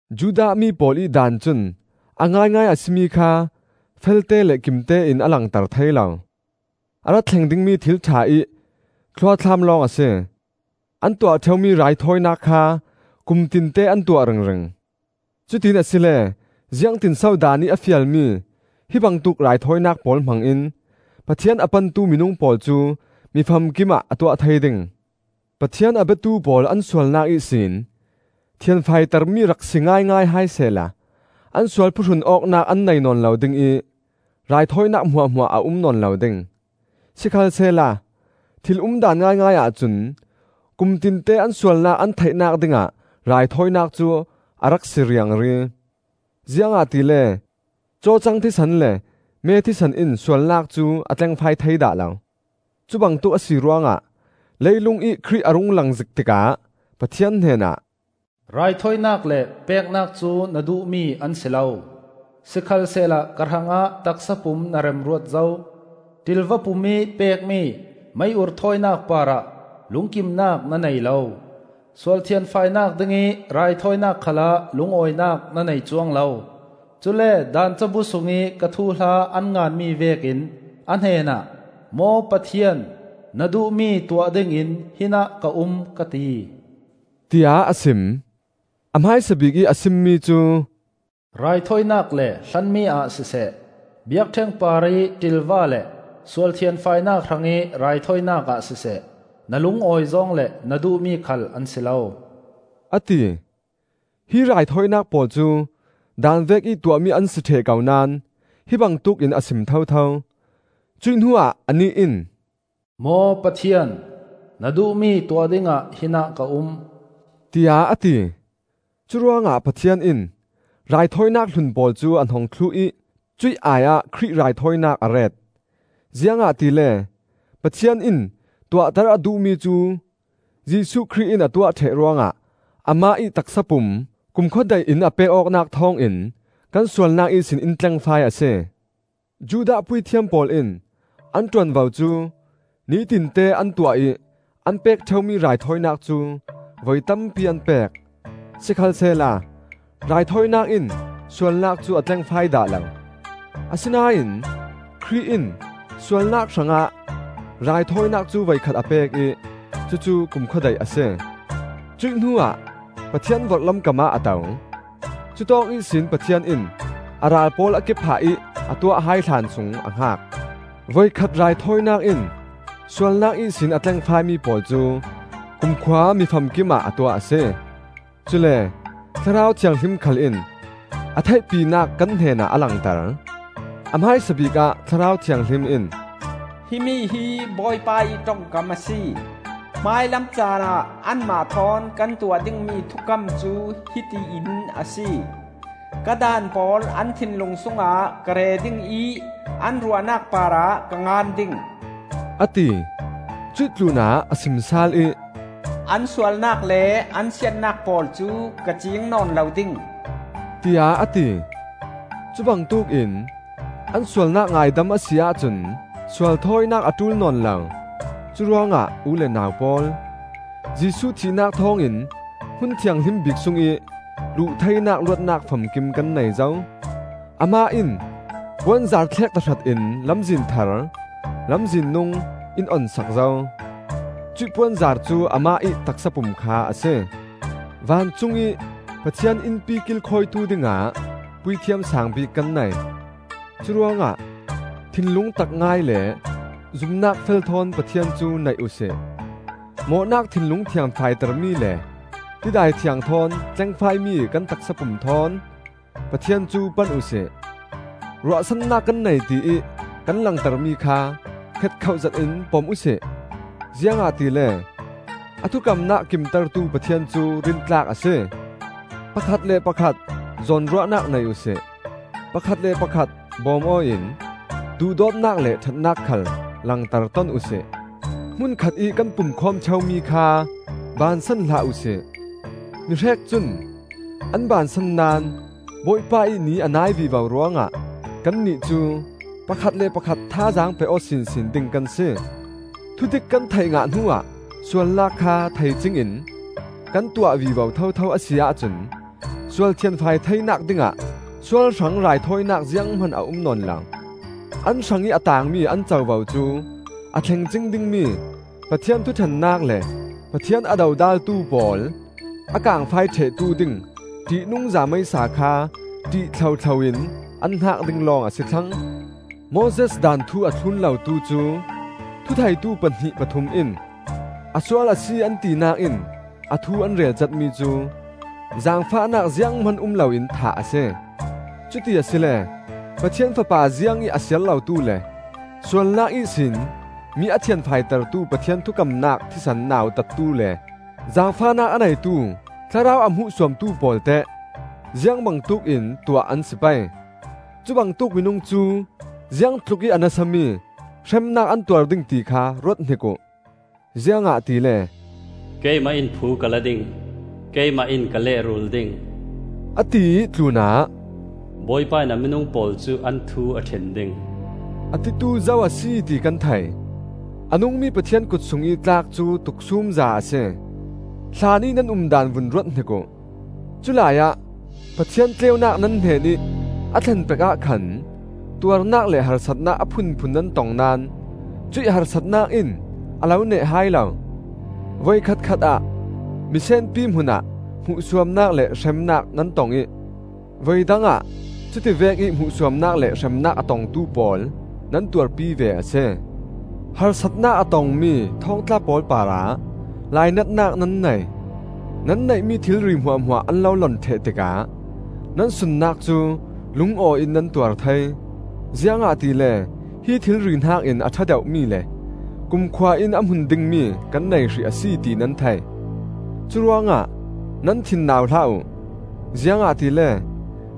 Judah mi pawl ih Daan cun a ngaingai a si mi kha felte le kimtein a langter thei lo; a ra thleng dingmi thil ṭha ih thluathlam lawng a si. An tuah ṭheumi raithawinak kha kumtinte an tuah ringring. Cutiin asile ziangtinso Daan ih a fialmi hi bangtuk raithawinak pawl hmangin Pathian a pantu minung pawl cu mi famkimah a tuah thei ding? Pathian a biatu pawl an sualnak ihsin thianfaitermi rak si ngaingai hai sehla an sual phuhrunawknak an nei nawn lo ding ih raithawinak hmuahhmuah a um nawn lo ding. Sikhalsehla thil umdaan ngaingai ahcun kumtinte an sualnak an theihnak dingah raithawinak cu a rak si riangri. Ziangahtile cawcang thisen le me thisen in sualnak cu a tlengfai thei dah lo. Cubangtuk a si ruangah leilungih Khrih a rung lang zik tikah Pathian hnenah, “Raithawinak le peknak cu na duhmi an si lo; sikhalsehla ka hrangah taksapum na remruat zo. Ṭilva pum ih pekmi mei-ur thawinak parah lungkimnak na nei lo. Sual thianfainak dingih raithawinak khalah lungawinak na nei cuang lo. Cule Daan cabu sungih ka thuhla an nganmi vekin a hnenah, ‘Maw Pathian, na duhmi tuah dingin hinah ka um,’ ka ti,” tiah a sim. A hmaisa bikih a simmi cu, “Raithawinak le hlanmi ah siseh, biakṭheng parih ṭilva le sual thianfainak hrangih raithawinak ah siseh, na lungawi zawng le na duhmi khal an si lo,” a ti. Hi raithawinak pawl cu Daan vekih tuahmi an si ṭheh ko naón hi bangtuk in a sim thotho. Cuih hnuah anih in, “Maw Pathian, na duhmi tuah dingah hinah ka um,” tiah a ti. Curuangah Pathian in raithawinak hlun pawl cu a hnong thluh ih cuih ai-ah Khrih raithawinak a ret. Ziangahtile Pathian in tuahter a duhmi cu Jesuh Khrih in a tuah ṭheh ruangah amah ih taksapum kumkhua daih in a pek awknak thawngin kan sualnak ihsin in tlengfai a si. Judah puithiam pawl in an ṭuanvo cu nitinte an tuah ih an pek ṭheumi raithawinak cu voi tampi an pek. Sikhalsehla raithawinak in sualnak cu a tlengfai dah lo. Asinain Khrih in sualnak hrangah raithawinak cu voikhat a pek ih cucu kumkhua daih a si; cuih hnuah Pathian vorhlam kamah a to. Cutawk ihsin Pathian in a ral pawl a ke-phah ih a tuah hai hlan sung a hngak. Voikhat raithawinak in sualnak ihsin a tlengfaimi pawl cu kumkhua mi famkimah a tuah a si. Cule Thlarau Thianghlim khal in a theihpinak kan hnenah a langter. A hmaisabik ah Thlarau Thianghlim in, “Himi hi Bawipa ih ṭongkam a si: Hmailam caanah anmah thawn kan tuah dingmi thukam cu hiti in a si; Ka daan pawl an thinlung sungah ka re ding ih an ruahnak parah ka ngan ding,” a ti. Cuih tlunah a sim sal ih, “An sualnak le an siatnak pawl cu ka ciing nawn lo ding,” tiah a ti. Cubangtuk in an sualnak ngaidam a si ahcun sualthawinak a ṭul nawn lo. Curuangah u le nau pawl, Jesuh thihnak thawngin Hmun Thianghlim Bik sungih luh theinak luatnak famkim kan nei zo. Amah in puanzar thlek tahratin lamzin thar, lamzin nung, in on sak zo. Cuih puanzar cu amah ih taksa pum kha a si. Vancung ih Pathian innpi kilkhawitu dingah Puithiam Saang bik kan nei. Curuangah thinlung tak ngai le zumnak fel thawn Pathian cu naih uhsi. Mawhnak thinlung thianfaitermi le tidai thiang thawn tlengfaimi kan taksapum thawn Pathian cu pan uhsi. Ruahsannak kan nei tiih kan langtermi kha hngetkhoh zetin pom uhsi; ziangahtile a thukamnak a kimtertu Pathian cu rintlak a si. Pakhat le pakhat zawnruahnak nei uhsi; pakhat le pakhat bawm aw in duhdawtnak le ṭhatnak khal langter ton uhsi. Hmunkhatih kan pumkhawm ṭheumi kha baansan hlah uhsi. Mihrek cun an baansan naón Bawipa ih Ni a nai vivo ruangah, kannih cu pakhat le pakhat thazaang pe-aw sinsin ding kan si. Thudik kan theih ngah hnuah sualnak kha thei cingin kan tuah vivo thotho a si ahcun sual thianfai theinak dingah sual hrang raithawinak zianghman a um nawn lo. An hrangih a taangmi an covo cu a thleng cing dingmi Pathian thuṭhennak le Pathian a dodaltu pawl a kaangfai ṭhehtu ding ṭihnungza meisa kha ṭih thlohthlo in an hngak ding lawng a si thlang. Moses Daan thu a thlun lotu cu thutheitu pahnih pathum in a sual a si an tinak in a thu an relcatmi cu, zaangfahnak zianghman um loin thah a si. Cuti asile, Pathian Fapa ziangih a siar lotu le sualnak ihsin mi a thianfaitertu Pathian thukamnak thisen nautattu le, zaangfahnak a neitu Thlarau a hmuhsuamtu pawl teh ziang bangtuk in tuah an si pei? Cubangtuk minung cu ziangtlukih a nasami hremnak an tuar ding tikha ruat hnik uh! Ziangahtile, “Keimah in phu ka la ding, keimah in ka lehrul ding,” a tiih tlunah, “Bawipa in a minung pawl cu an thu a ṭhen ding,” a titu zo a si ti kan thei. A nungmi Pathian kut sungih tlak cu tuksumza a si. Hlanih nan um daan vun ruathnik uh. Culai ah Pathian tleunak nan hnenih a thlen pek ah khan tuarnak le harsatnak a phunphun nan tong naón cuih harsatnak in a lo neh hai lo. Voikhat khatah misenpi hmuhah hmuhsuamnak le hremnak nan tong ih voi dangah cuti vekih hmuhsuamnak le hremnak a tongtu pawl nan tuarpi ve a si. Harsatnak a tongmi thawngtla pawl parah lainatnak nan nei. Nan neihmi thilri hmuahhmuah an lo lon ṭheh tikah nan sunnak cu lungawiin nan tuar thei, ziangahtile hi thilri hnakin a ṭha deuhmi le kumkhua in a hmun dingmi kan nei hrih a si, ti nan thei. Curuangah nan thin nau hlah uh, ziangahtile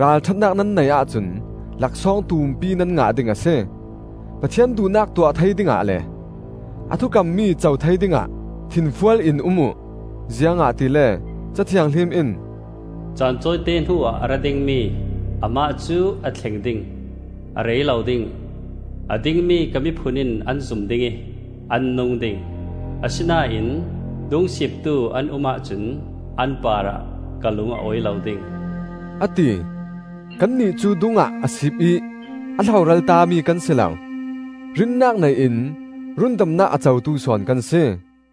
ralṭhatnak nan neih ahcun laksawng tumpi nan ngah ding a si. Pathian duhnak tuah thei dingah le a thukammi co thei dingah thinfual in um uh. Ziangahtile Ca Thianghlim in, “Caan tawite hnuah a ra dingmi Amah cu a thleng ding, a rei lo ding. A dingmi ka miphun in an zum ding ih an nung ding; Asinain dungsiptu an um ahcun, an parah ka lung a awi lo ding,” a ti. Kannih cu dungah a siip ih a hloral tami kan si lo. Rinnak nei in rundamnak a cotu sawn kan si.